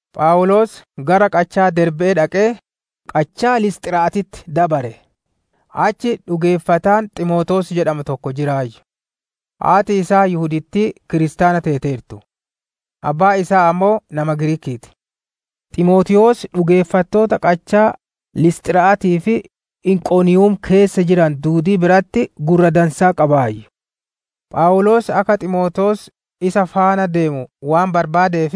Phawuloos gara qachaa Derbe'ee dhaqee, qachaa Lisxira'aatitti dabare. Achi dhugeeffataan Ximootewoos jedhamu tokko jiraayyu. Haati isaa Yihudittii kiristaana teeteertu; abbaan isaa ammoo nama Giriiki'ii ti. Ximootewoos dhugeeffattoota qachaa Lisxira'aatii fi Inqoniiyum keessa jiranu duudii biratti gurra dansaa qabaayyu. Phawuloos akka Ximootewoos isa faana deemu waan barbaadeef,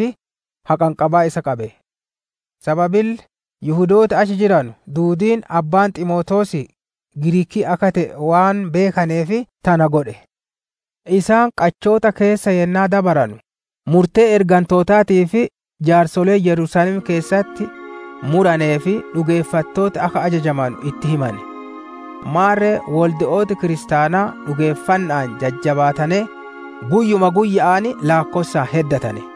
haqanqabaa isa qabe. Sababille Yihudooti achi jiranu duudiin abbaan Ximootewoosii Giriikii akka te'e waan beekaneef tana godhe. Isaan qachoota keessa yennaa dabaranu, murtee ergantootaa fi jaarsoleen Yerusaalem keessatti muraneef dhugeeffattooti akka ajajamanu itti himane. Maarre wolde'ooti Kiristaanaa dhugeeffanna'aan jajjabaatanee, guyyuma guyya'aan laakkossaan heddatane.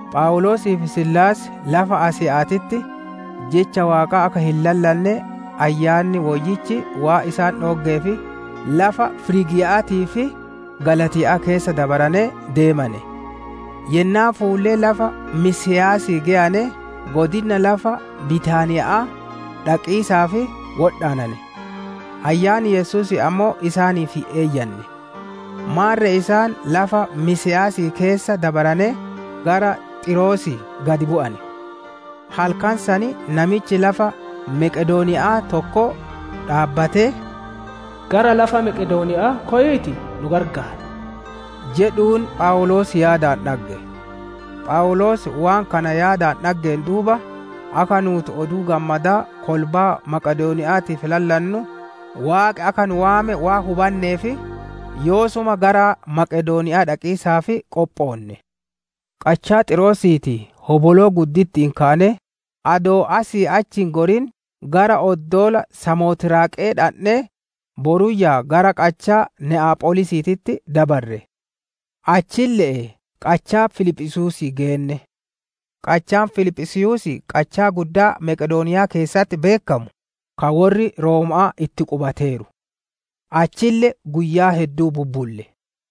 Phawuloosii fi Siilaas lafa Asiya'aatitti Jecha Waaqaa akka hin lallanne Ayyaanni Woyyichi waan dhooggeef lafa Firiigiya'aatii fi Galaatiya'aa keessa dabaranee deemane. Yennaa fuullee lafa Misiyaasii geyane godina lafa Bitaaniya'aa, dhaqiisaaf wodhaanane. Ayyaanni Yesuusii ammoo isaaniif hin eeyyanne. Maarre isaan lafa Misiyaasii keessa dabaranee, gara Xiiroosii gad bu'ane. Halkan san namichi lafa Meqedooniya'aa tokko dhaabbatee, «Gara lafa Meqedooniya'aa koyiitii nu qarqaar» jedhuun Phawuloos yaadaan dhagge. Phawuloos waan kana yaadaan dhaggeen duuba, akka nuuti Oduu Gammadaa kolbaa Maqedooniya'aatiif lallannu, Waaqi akka nu waame waan hubanneef, yoosuma gara Maqedooniya'aa dhaqiisaaf qophoonne. Qachaa Xiiroosiitii hoboloo gudditti'iin kaanee, adoo asii achi hin gorin gara oddoola Samotiraaqe'ee dhandhee, boruyyaa gara qachaa Ne'apholiisitti dabarre. Achille'ee qachaa Filiphisiiyuusii geenne; qachaan Filiphisiiyuusii qachaa guddaa Maqedooniyaa keessatti beekkamu, ka worri Rooma'aa itti qubateeru; achille guyyaa hedduu bubbulle.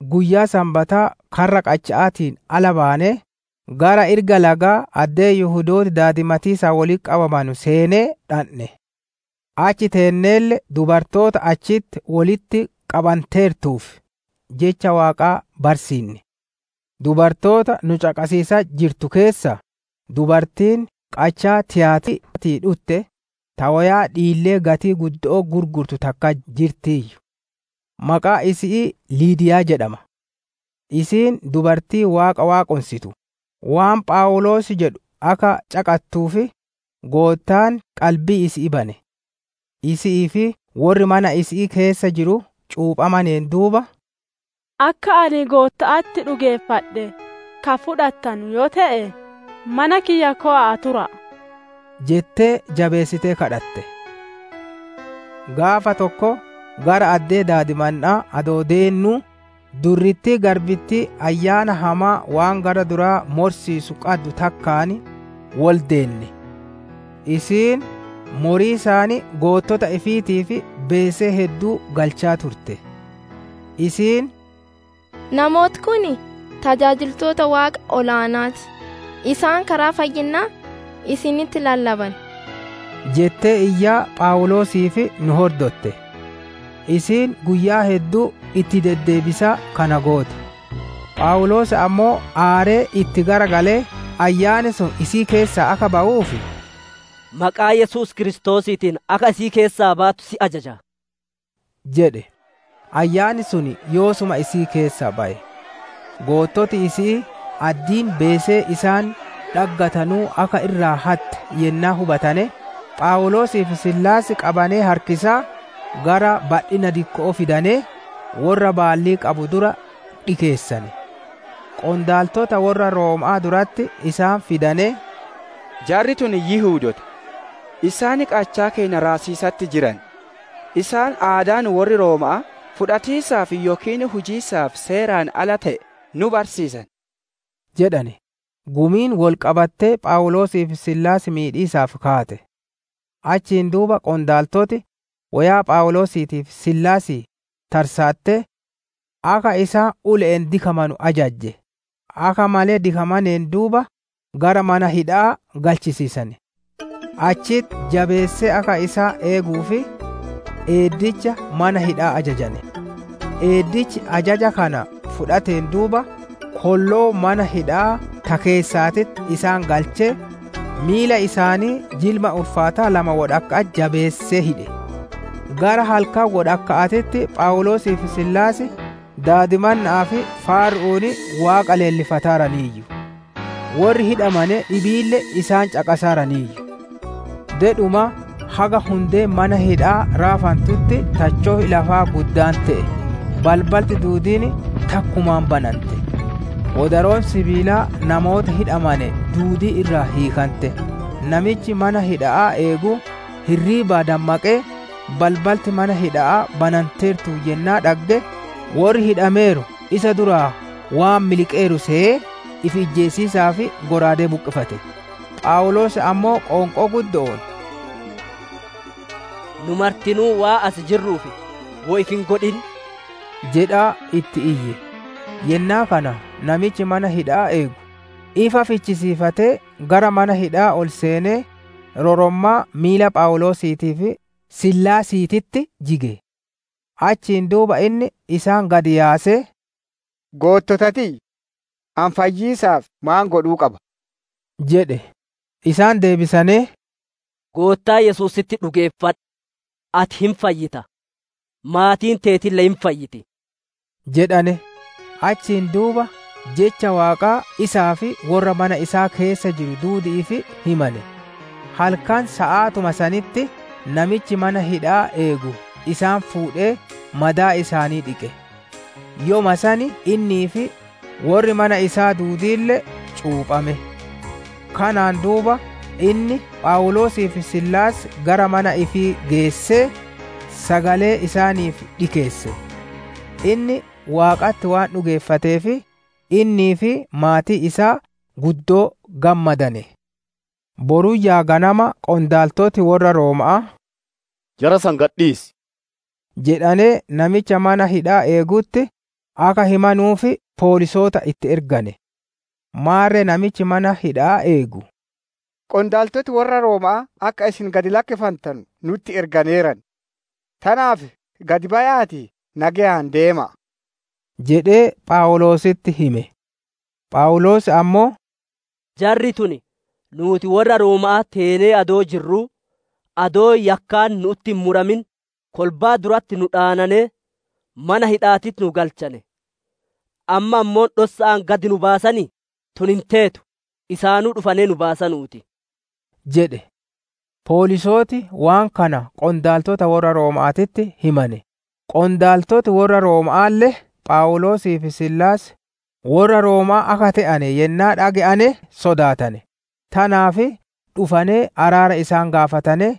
Guyyaa Sanbataa karra qacha'aatiin ala baanee, gara irga lagaa addee Yihudooti daadimataaf wolitti qabamanuu seenee dhandhe; achi teenneelle dubartoota achitti wolitti qabanteertu Jecha Waaqaa barsiinne. Dubartoota nu caqasiisatti jirtu keessaa, dubartiin qachaa Tiyaatira'aatii dhutte, ta woyaa dhiillee gatii guddo'oo gurgurtu takka jirtiiyyu; maqaan isi'ii Liidiyaa jedhama. Isiin dubartii Waaqa waaqonsitu; waan Phawuloos jedhu akka caqattuuf, Goottaan qalbii isi'ii bane. Isi'ii fi worri mana isi'ii keessa jiru cuuphameen duuba, «Akka ani Gootta'atti dhugeeffadhe ka fudhattanu yoo te'e, mana kiyya kowa'aa tura'a» jettee jabeessitee kadhatte. Gaafa tokko gara addee daadimanna'aa adoo deennuu, durrittii garbittii ayyaana hamaa waan gara duraa morsiisu qaddu takkaan woldeenne; isiin moriisaan goottota ifiitiif beesee hedduu galchaa turte. Isiin, «Namooti kun tajaajiltoota Waaqa Ol-aana'aa ti! Isaan karaa fayyinnaa isinitti lallaban» jettee iyyaa Phawuloosii fi nu hordotte. Isiin guyyaa hedduu itti deddeebisaa kana goote. Phawuloos ammoo aaree itti garagalee ayyaanni sun isii keessaa akka bawuuf, «Maqaa Yesuus Kiristoosiitiin akka isii keessaa baatu si ajaja» jedhe; ayyaanni sun yoosuma isii keessaa baye. Goottoti isi'ii, addiin beesee isaan dhaggatanuu akka irraa hatte yennaa hubatane, Phawuloosii fi Siilaas qabanee harkisaa gara badhinna dikko'oo fidanee, worra baallii qabu dura dhikeessane. Qondaaltota worra Rooma'aa duratti isaan fidanee, «Jarri tun Yihudoota; isaan qachaa keenna raasiisatti jiran. Isaan aadaa nu worri Rooma'aa fudhatiisaaf yookiin hujiisaaf seeraan ala te'e nu barsiisan» jedhane. Gumiin wol qabattee Phawuloosii fi Siilaas miidhiisaaf kaate. Achiin duuba qondaaltoti, woyaa Phawuloosiitii fi Siilaasii tarsaattee akka isaan ule'een dikamanu ajajje. Akka malee dikamaneen duuba gara mana hidha'aa galchisiisane; achitti jabeessee akka isaan eeguuf, eeddicha mana hidha'aa ajajane. Eeddichi ajaja kana fudhateen duuba, kolloo mana hidha'aa ta keessaatitti isaan galchee, miila isaanii jirma ulfaataa lama wodhakka'atti jabeessee hidhe. Gara halkan wodhakka'aatitti Phawuloosii fi Siilaas daadimanna'aa fi faaru'uun Waaqa leellifataaraniiyyu; worri hidhame dhibiille isaan caqasaaraayyu. Dedhuma haga hundeen mana hidha'aa raafantutti tacho'i lafaa guddaan te'e; balbalti duudiin takkumaan banante; wodaroon sibiilaa namoota hidhamane duudii irraa hiikante. Namichi mana hidha'aa eegu hirriibaa dammaqee, balbalti mana hidha'aa bananteertuun yennaa dhagge, worri hidhameeru isa duraa waan miliqeeru seyee, ifi ijjeesiisaaf shallaagaa buqqifate. Phawuloos ammoo qoonqoo guddo'oon, «Nu martinuu waan as jirruuf, woy ifi hin godhin» jedhaa itti iyye. Yennaa kana namichi mana hidha'aa eegu, ifa fichisiifatee gara mana hidha'aa ol seenee, rorommaa miila Phawuloosiitii fi Siilaasititti jige. Achiin duuba inni isaan gad yaasee, «Goottota tiyya! Ani fayyiisaaf maan godhuu qaba?» jedhe. Isaan deebisanee, «Goottaa Yesuusitti dhugeeffadhu; ati hin fayyita; maatiin teetille hin fayyiti» jedhane. Achiin duuba Jecha Waaqaa isaa fi worra mana isaa keessa jiru duudi'iif himane. Halkan saatuma sanitti, namichi mana hidha'aa eegu isaan fuudhee madaa isaanii dhiqe; yoma san innii fi worri mana isaa duudiille cuuphame. Kanaan duuba inni Phawuloosii fi Siilaas gara mana ifii geessee, sagalee isaaniif dhikeesse; inni Waaqatti waan dhugeeffateef, innii fi maatiin isaa guddoo gammadane. Boruyyaa ganama qondaaltoti worra Rooma'aa, «Jara san gad dhiisi!» jedhanee namicha mana hidha'aa eegutti akka himanuuf Poolisoota itti ergane. Maarre namichi mana hidha'aa eegu, «Qondaaltoti worra Rooma'aa akka isin gad lakkifantanu nutti erganeeran; tanaaf gad baya'aatii nageyaan deema'a» jedhee Phawuloositti hime. Phawuloos ammoo, «Jarri tun nuuti worra Rooma'aa teenee adoo jirruu, adoo yakkaan nu'utti hin muramin kolbaa duratti nu dhaananee, mana hidha'aatitti nu galchane; amma ammoo dhossa'aan gad nu baasanii? Tun hin teetu! Isaanuu dhufanee nu baasanuu ti» jedhe. Poolisooti waan kana qondaaltota worra Rooma'aatitti himane; qondaaltoti worra Rooma'aalle Phawuloosii fi Siilaas worra Rooma'aa akka te'ane yennaa dhage'ane sodaatane. Tanaaf dhufanee araara isaan gaafatanee,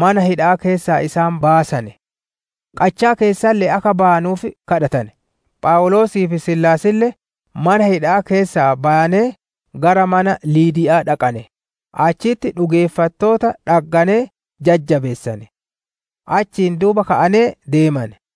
mana hidha'aa keessaa isaan baasane; qachaa keessalle'ee akka bayanuuf kadhatane. Phawuloosii fi Siilaasille mana hidha'aa keessaa bayanee, gara mana Liidiya'aa dhaqane. Achitti dhugeeffattoota dhagganee jajjabeessane; achiin duuba ka'anee deemane.